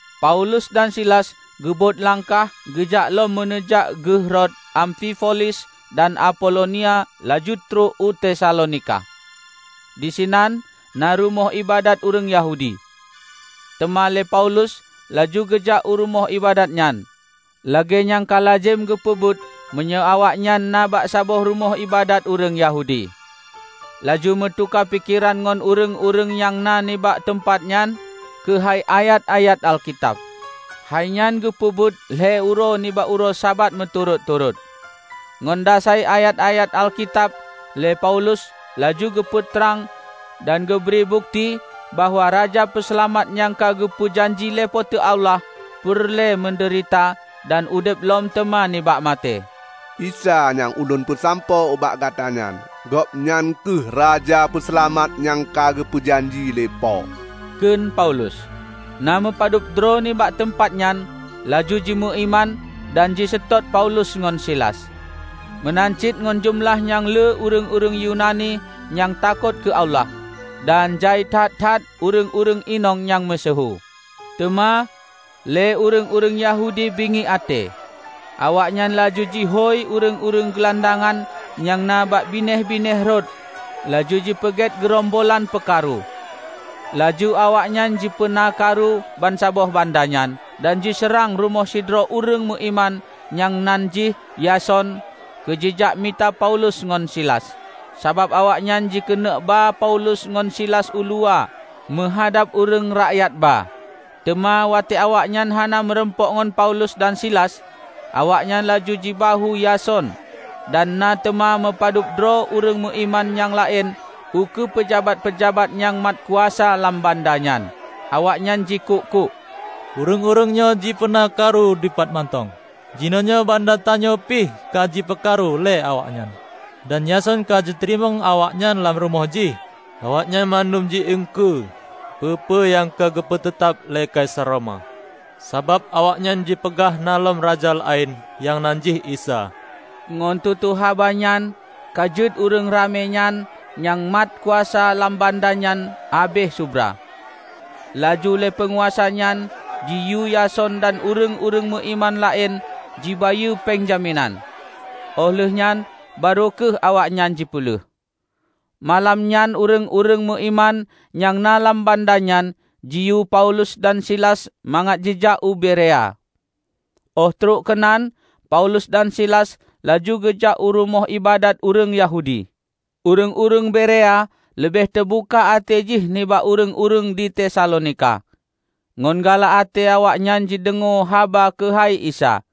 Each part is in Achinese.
Paulus dan Silas geubot langkah geujak lom meuneujak geuh rot Amfipolis dan Apolonia laju trok u Tesalonika. Disinan na rumoh iébadat ureuëng Yahudi. Teuma lé Paulus laju geujak u rumoh iébadat nyan -- lagée nyang ka lazem geupeubuet meunyoe awaknyan na bak saboh rumoh iébadat ureuëng Yahudi -- laju meutuka pikeran ngon ureuëng-ureuëng nyang na nibak teumpat nyan keuhai ayat-ayat Alkitab. Hainyan geupeubuet lhée uroe nibak uroe Sabat meuturot-turot. Ngon dasai ayat-ayat Alkitab lé Paulus laju geupeu trang dan geubri bukeuti bahwa Raja Peuseulamat nyang ka geupeu janji lé Po teu Allah peureulée meudeurita dan udeb lom teuma nibak maté. "Isa nyang ulôn peusampoe ubak gata nyan, Gobnyan kheueh Raja Peuseulamat nyang ka geupeujanji lé Po," kheun Paulus. Na meupadub droe nibak teumpat nyan laju jimeuiman dan jiseutôt Paulus ngon Silas; meunan cit ngon jeumeulah nyang le ureuëng-ureuëng Yunani nyang takot keu Allah, dan jai that-that ureuëng-ureuëng inong nyang meusyeuhu. Teuma lé ureuëng-ureuëng Yahudi bingiek até. Awaknyan laju jihôi ureuëng-ureuëng geulandangan nyang na bak binéh-binéh rot laju jipeugét geurombolan peukaru. Laju awaknyan jipeunakaru bansaboh banda nyan dan jiseurang rumoh sidroe ureuëng meuiman nyang nan jih Yason keu jijak mita Paulus ngon Silas, sabab awaknyan jikeuneuk ba Paulus ngon Silas uluwa meuhadab ureuëng rakyat ba. Teuma watée awaknyan hana meurumpok ngon Paulus dan Silas, awaknyan laju jibahue Yason dan na teuma meupadubdroe ureuëng meuiman nyang laén ukeue peujabat-peujabat nyang mat kuasa lam banda nyan. Awaknyan jikuk-kuk, "Ureuëng-ureuëng nyoe jipeuna karu dipat mantong! Jinoenyoe banda tanyoe pih ka jipeukaru lé awaknyan, dan Yason ka jiteurimong awaknyan lam rumoh jih. Awaknyan mandum ji iengkeue peue-peue nyang ka geupeu teutab lé Kaisar Roma, sabab awaknyan jipeugah na lom raja laén nyang nan jih Isa." Ngon tutoe haba nyan ka jeuet ureuëng ramé dan nyang mat kuasa lam banda nyan habéh subra. Laju lé peunguasa nyan jiyue Yason dan ureuëng-ureuëng meuiman laén jibayeue péng jaminan. Óh lheuehnyan barô kheueh awaknyan jipeuleueh. Malam nyan ureuëng-ureuëng meuiman nyang na lam banda nyan jiyue Paulus dan Silas mangat jijak u Berea. Óh trok keunan, Paulus dan Silas laju geujak u rumoh iébadat ureuëng Yahudi. Ureuëng-ureuëng Berea leubeh teubuka até jih nibak ureuëng-ureuëng di Tesalonika. Ngon galak até awaknyan jideungoe haba keuhai Isa,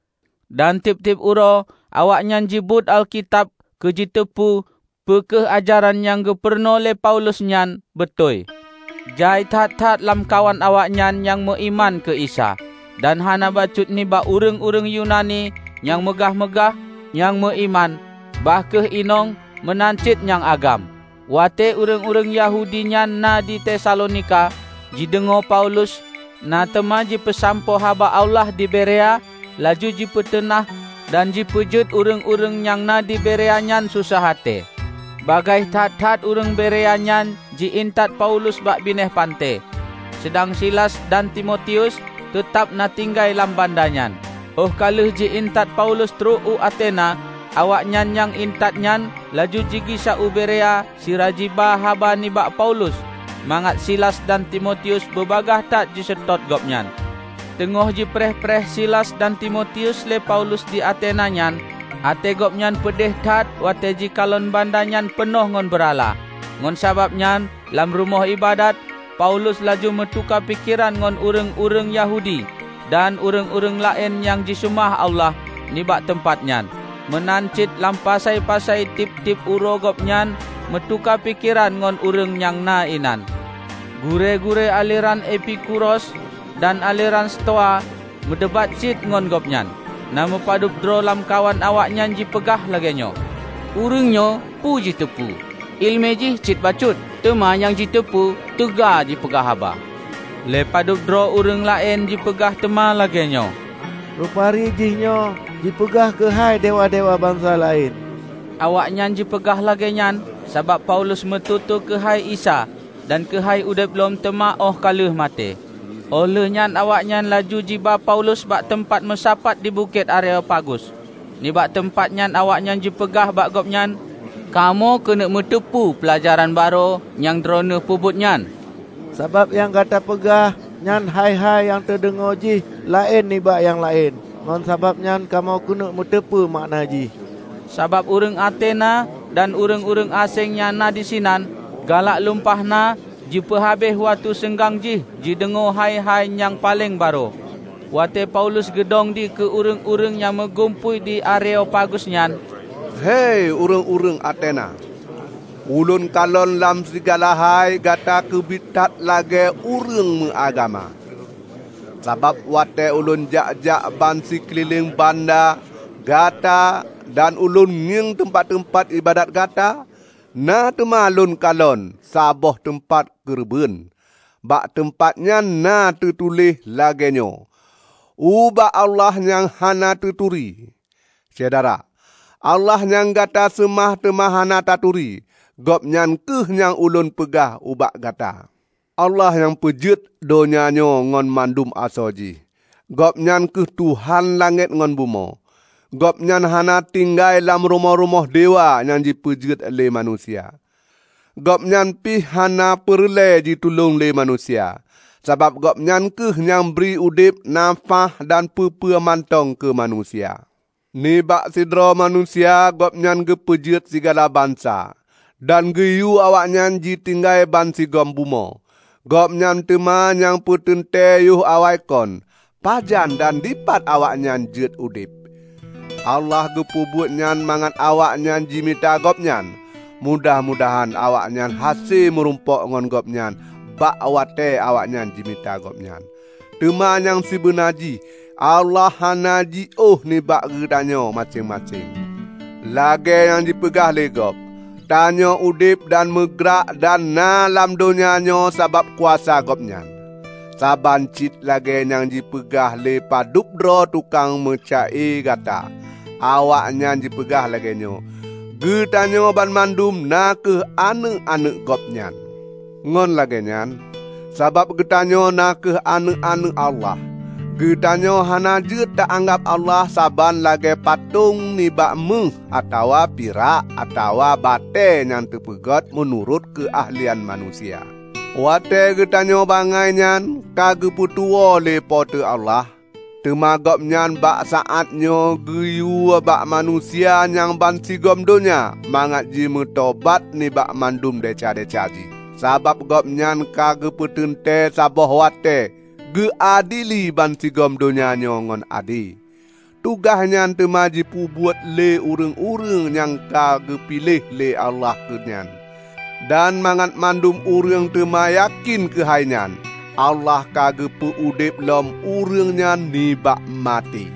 dan tieb-tieb uroe awaknyan jibeuet Alkitab keu jiteupeu peu kheueh ajaran nyang geupurunoe lé Paulus nyan beutôi. Jai that-that lamkawan awaknyan nyang meuiman keu Isa, dan hana bacut nibak ureuëng-ureuëng Yunani nyang meugah-meugah, nyang meuiman; bah kheueh inong meunan cit nyang agam. Watée ureuëng-ureuëng Yahudi nyang na di Tesalonika jideungoe Paulus na teuma jipeusampoe haba Allah di Berea laju jipiteunah dan jipeujeuet ureuëng-ureuëng nyang na di Berea nyan sosah até. Bagaih that-that ureuëng Berea nyan jiintat Paulus bak binéh panté, seudang Silas dan Timotius teutab na tinggai lam banda nyan. Óh ka lheueh ji-intat Paulus trok u Atena, awaknyan nyang intat nyan laju jigisa u Berea sira jiba haba nibak Paulus mangat Silas dan Timotius bubagaih that jiseutôt gobnyan. Teungoh jipreh-preh Silas dan Timotius lé Paulus di Atena nyan, até gobnyan peudeh that watée jikalon banda nyan peunoh ngon beurala. Ngon sabab nyan, lam rumoh iébadat, Paulus laju meutuka pikeran ngon ureuëng-ureuëng Yahudi dan ureuëng-ureuëng laén nyang jiseumah Allah nibak teumpat nyan. Meunan cit lam pasai-pasai tieb-tieb uroe gobnyan meutuka pikeran ngon ureuëng nyang na inan. Gurée-gurée aleran Epikuros dan aleran Stoa meudebat cit ngon gobnyan. Na meupadub droe lamkawan awaknyan jipeugah lagée nyoe, "Ureuëng nyoe peue jiteupeu? Iéleumé jih cit bacut, teuma nyang jiteupeu teuga jipeugah haba!" Lé padub droe ureuëng laén jipeugah teuma lagée nyoe, "Rupari jihnyoe jipeugah keuhai dewa-dewa bansa laén." Awaknyan jipeugah lagée nyan, sabab Paulus meututoe keuhai Isa dan keuhai udeb lom teuma óh ka lheueh maté. Óh lheueh nyan awaknyan laju jiba Paulus bak teumpat meusapat di Bukét Areopagus. Nibak teumpat nyan awaknyan jipeugah bak gobnyan, "Kamoe keuneuk meuteupeue peulajaran barô nyang droeneueh peubeuet nyan. Sabab nyang gata peugah nyan hai-hai nyang teudeungoe jih laén nibak nyang laén. Ngon sababnyan kamoe keuneuk muteupeu makna jih." ( Sabab ureuëng Atena dan ureuëng-ureuëng aséng nyang na disinan galak lumpah na jipeuhabéh watée seunggang jih jideungoe hai-hai nyang paleng barô.) Watée Paulus geudong dikeue ureuëng-ureuëng nyang meugumpôi di Areopagus nyan, "Hei ureuëng-ureuëng Atena! Ulôn kalon lam sigala hai gata keubiet that lagée ureuëng meuagama. Sabab watée ulôn jak-jak bansikeulileng banda gata dan ulôn ngieng teumpat-teumpat iébadat gata, na teuma lôn kalon saboh teumpat keureubeuen; bak teumpat nyan na teutuléh lagée nyoe, 'Ubak Allah Nyang Hana Teuturi.' Syedara, Allah nyang gata seumah teuma hana taturi, Gobnyan kheueh nyang ulôn peugah ubak gata. Allah nyang peujeuet donya nyoe ngon mandum asoe jih, Gobnyan kheueh Tuhan langét ngon bumoe. Gobnyan hana tinggai lam rumoh-rumoh dewa nyang jipeugét lé manusia. Gobnyan pih hana peureulée jitulông lé manusia, sabab Gobnyan kheueh nyang bri udeb na nafáh dan peue-peue mantong keu manusia. Nibak sidroe manusia Gobnyan geupeujeuet sigala bansa dan geuyue awaknyan jitinggai bansigom bumoe. Gobnyan teuma nyang peuteuntée yoh awaikon, pajan dan dipat awaknyan jeuet udeb. Allah geupeubuet nyan mangat awaknyan jimita Gobnyan. Mudah mudahan awaknyan hase meurumpok ngon Gobnyan bak watée awaknyan jimita Gobnyan. Teuma nyang sibeuna jih Allah hana jiôh nibak geutanyoe maséng-maséng. Lagée nyang jipeugah lé gob, 'Tanyoe udeb dan meugrak dan na lam donya nyoe sabab kuasa Gobnyan.' Saban cit lagée nyang jipeugah lé padub droe tukang meuca-e gata. Awaknyan jipeugah lagée nyoe, 'Geutanyoe banmandum na kheueh aneuëk-aneuëk Gobnyan.' Ngon lagéenyan, sabab geutanyoe na kheueh aneuëk-aneuëk Allah, geutanyoe hana jeuet ta anggab Allah saban lagée patong nibak méuh atawa pirak atawa batée nyang teupeugét meunurot keu ahlian manusia. Watée geutanyoe bangai nyan ka geupeutuwoe lé Po teu Allah, teuma Gobnyan bak saátnyoe geuyue bak manusia nyang bansigom donya mangat jimeutobat nibak mandum desya-desya jih. Sabab Gobnyan ka geupeuteuntée saboh watée geuadili bansigom donya nyoe ngon ade. Tugaih nyan teuma jipeubuet lé ureuëng-ureuëng nyang ka geupiléh lé Allah keu nyan. Dan mangat mandum ureuëng teuma yakén keuhai nyan, Allah ka geupeu udeb lom ureuëng nyan nibak maté!"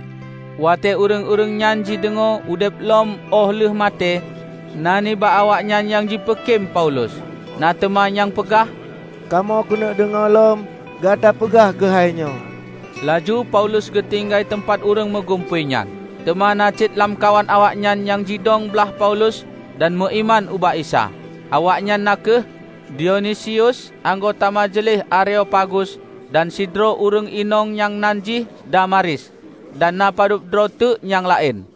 Watée ureuëng-ureuëng nyan jideungoe udeb lom óh lheueh maté, na nibak awaknyan nyang jipeukém Paulus. Na teuma nyang peugah, "Kamoe keuneuk deungoe lom Gata peugah keuhai nyoe." Laju Paulus geutinggai teumpat ureuëng meugumpôi nyan. Teuma na cit lamkawan awaknyan nyang jidong blaih Paulus dan meuiman ubak Isa, awaknyan na kheueh: Dionisius anggota majeuleh Areopagus, dan sidroe ureuëng inong nyang nan jih Damaris, dan na padub droe teuk nyang laén.